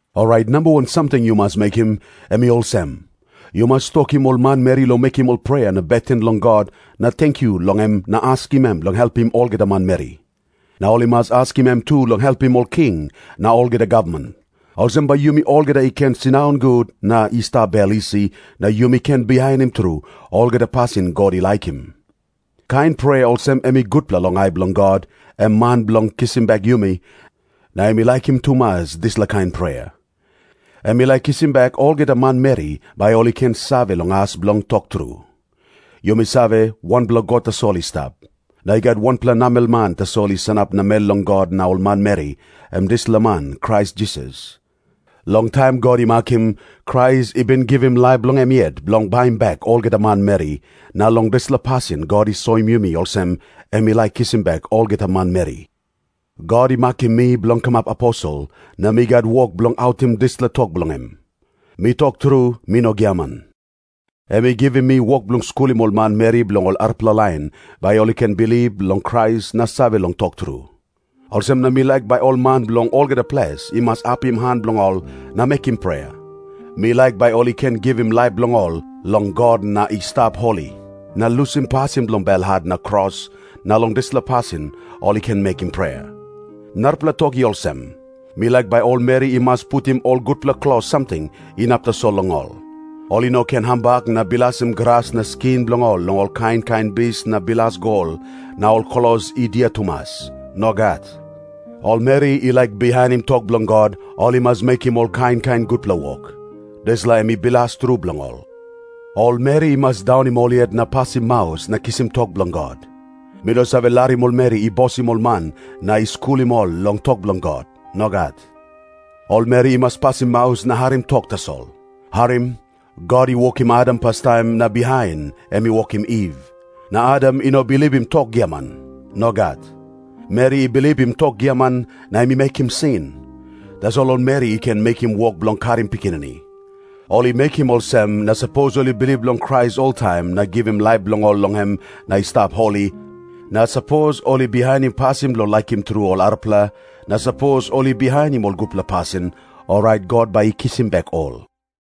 Orait namba wan samting yu mas mekim, em i olsem. Yu mas tokim ol manmeri long mekim ol prea na beten long God na tenkyu long em na askim em long helpim olgeta manmeri. Na ol i mas askim em tu long helpim ol king na olgeta gavman. Olsem bai yumi olgeta i ken sindaun gut na i stap bel isi, na yumi ken bihainim tru olgeta pasin God i laikim. Kain prea olsem em i gutpela long ai bilong God, em Man bilong kisim bek yumi, na em i laikim tumas dispela kain prea. Em i laik kisim bek olgeta manmeri, bai ol i ken save long as bilong tok tru. Yumi save, wanpela God tasol i stap. Na i gat wanpela namelman tasol i sanap namel long God na ol manmeri, em dispela man Krais Jisas. Long taim God i makim, Krais i bin givim laip bilong em yet bilong baim bek olgeta manmeri, na long dispela pasin God i soim yumi olsem em i laik kisim bek olgeta manmeri. God i makim mi bilong kamap aposel, na mi gat wok bilong autim dispela tok bilong em. Mi tok tru, mi no giaman. Em i givim mi wok bilong skulim ol manmeri bilong ol arapela lain, bai ol i ken bilip long Krais na save long tok tru. Olsem na mi laik bai ol man bilong olgeta ples i mas apim han bilong ol na mekim prea. Mi laik bai ol i ken givim laip bilong ol long God na i stap holi, na lusim pasin bilong belhat na kros, na long dispela pasin ol i ken mekim prea. Narapela tok i olsem. Mi laik bai ol meri i mas putim ol gutpela klos samting, inap tasol long ol. Ol i no ken hambak na bilasim gras na skin bilong ol long ol kain kain bis na bilas gol na ol klos i dia tumas. Nogat. Ol meri i laik bihainim tok bilong God, ol i mas mekim ol kain kain gutpela wok. Dispela em i bilas tru bilong ol. Ol meri i mas daunim ol yet na pasim maus na kisim tok bilong God. Mi no save larim ol meri i bosim ol man na i skulim ol long tok bilong God. Nogat. Ol meri i mas pasim maus na harim tok tasol. Harim. God i wokim Adam pastaim, na bihain em i wokim Iv. Na Adam i no bilipim tok giaman. Nogat. Meri i bilipim tok giaman, na em i mekim sin. Tasol ol meri i ken mekim wok bilong karim pikinini. Ol i mekim olsem, na sapos ol i bilip long Krais oltaim na givim laip bilong ol long em na i stap holi, na sapos ol i bihainim pasin bilong laikim tru ol arapela, na sapos ol i bihainim ol gutpela pasin, orait God bai i kisim bek ol.